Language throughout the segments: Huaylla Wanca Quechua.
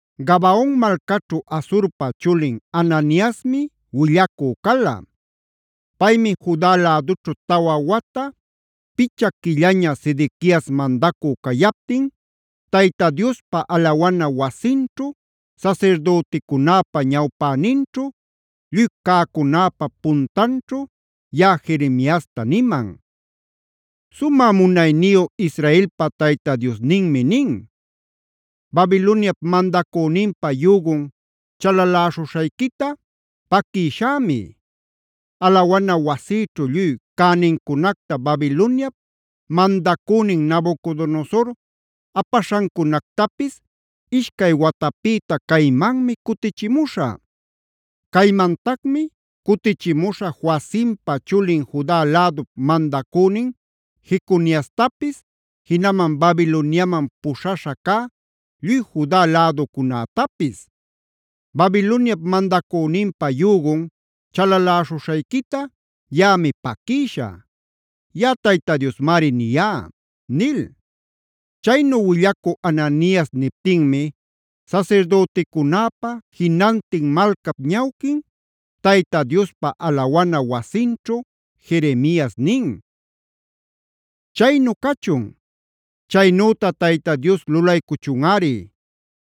Gabaon malcaćhu Azurpa chulin Hananiasmi willacü cala. Paymi Juda lädućhu tawa wata, picha quillaña Sedequiasa mandacü cayaptin Tayta Diospa alawana wasinćhu sasirdüticunäpa ñawpäninćhu, lluy cäcunäpa puntanćhu yaꞌa Jeremiasta niman: “Sumä munayniyu Israelpa Tayta Diosninmi nin: ‘Babiloniap mandacüninpa yügun chalaläśhuśhayquita paquïshämi. Alawana wasïćhu lluy cänincunacta Babiloniap mandacünin Nabucodonosor apaśhancunactapis ishcay watapïta caymanmi cutichimuśhä. Caymantacmi cutichimuśhä Joacimpa chulin Juda lädup mandacünin Jeconiastapis, jinaman Babiloniaman puśhaśha cä lluy Juda läducunätapis. Babiloniap mandacüninpa yügun chalaläśhuśhayquita yaꞌami paquïshä. Yaꞌa Tayta Diosmari niyá’” nil. Chaynu willacü Hananias niptinmi sasirdüticunäpa, jinantin malcap ñawquin Tayta Diospa alawana wasinćhu Jeremias nin: “¡Chaynu cachun! Chaynüta Tayta Dios lulaycuchunꞌari.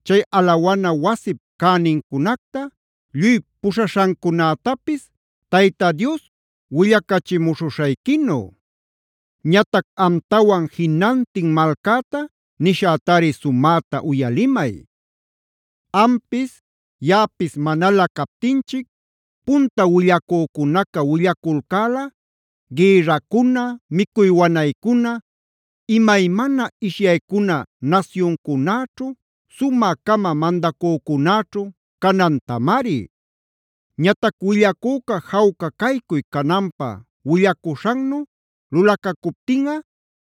Chay alawana wasip cänincunacta, lluy puśhaśhancunätapis Babiloniapi cutichimuchun Tayta Dios willacachimuśhuśhayquinü. Ñatac amtawan jinantin malcäta nishätari sumäta uyalimay: Ampis yaꞌapis manalä captinchic punta willacücunaca willaculcäla gïrracuna, micuy wanaycuna, imaymana ishyaycuna nasyuncunäćhu, sumä-cama mandacücunäćhu canantamari. Ñatac willacüca jawca caycuy cananpä willacuśhannu lulacacuptinꞌa,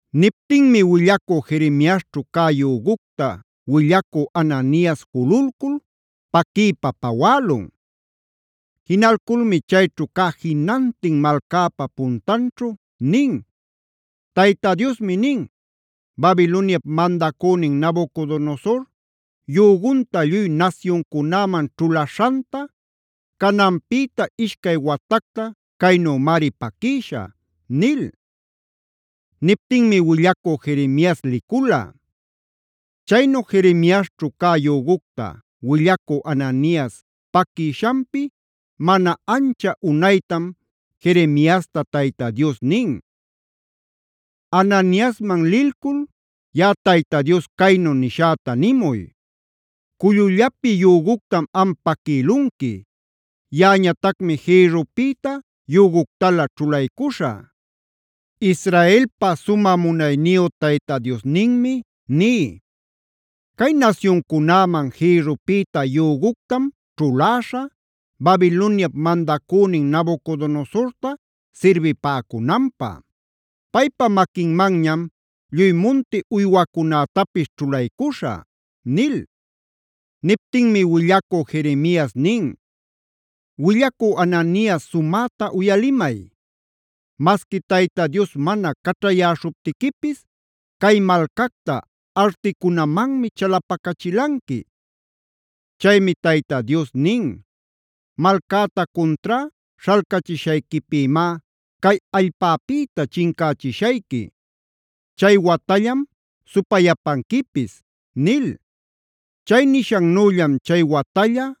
Niptinmi willacü Jeremiasćhu cä yügucta willacü Hananias jululcul paquiypa pawälun. Jinalculmi chayćhu cä jinantin malcäpa puntanćhu nin: “Tayta Diosmi nin: ‘Babiloniap mandacünin Nabucodonosor yügunta lluy nasyuncunäman ćhulaśhanta cananpïta ishcay watacta caynümari paquïshä’” nil. Niptinmi willacü Jeremias licula. Chaynu Jeremiasćhu cä yügucta willacü Hananias paquïshanpi mana ancha unaytam Jeremiasta Tayta Dios nin: “Hananiasman lilcul yaꞌa Tayta Dios caynu nishäta nimuy: ‘Cullullapi yüguctam am paquïlunqui. Yaꞌañatacmi jïrrupïta yüguctalä ćhulaycuśhä. Israelpa sumä munayniyu Tayta Diosninmi ní: Cay nasyuncunäman jïrrupïta yüguctam ćhuläśhä Babiloniap mandacünin Nabucodonosorta sirbipäcunanpä. Paypa maquinmanñam lluy munti uywacunätapis ćhulaycuśhä’” nil. Niptinmi willacü Jeremias nin: “Willacü Hananias sumäta uyalimay. Masqui Tayta Dios mana caćhayäśhuptiquipis, cay malcacta artiquicunamanmi chalapacachilanqui. Chaymi Tayta Dios nin: ‘Malcäta cuntrá śhalcachishayquipïmá cay allpäpïta chincächishayqui; chay watallam supayapanquipis’” nil. Chay nishannüllam chay watalla,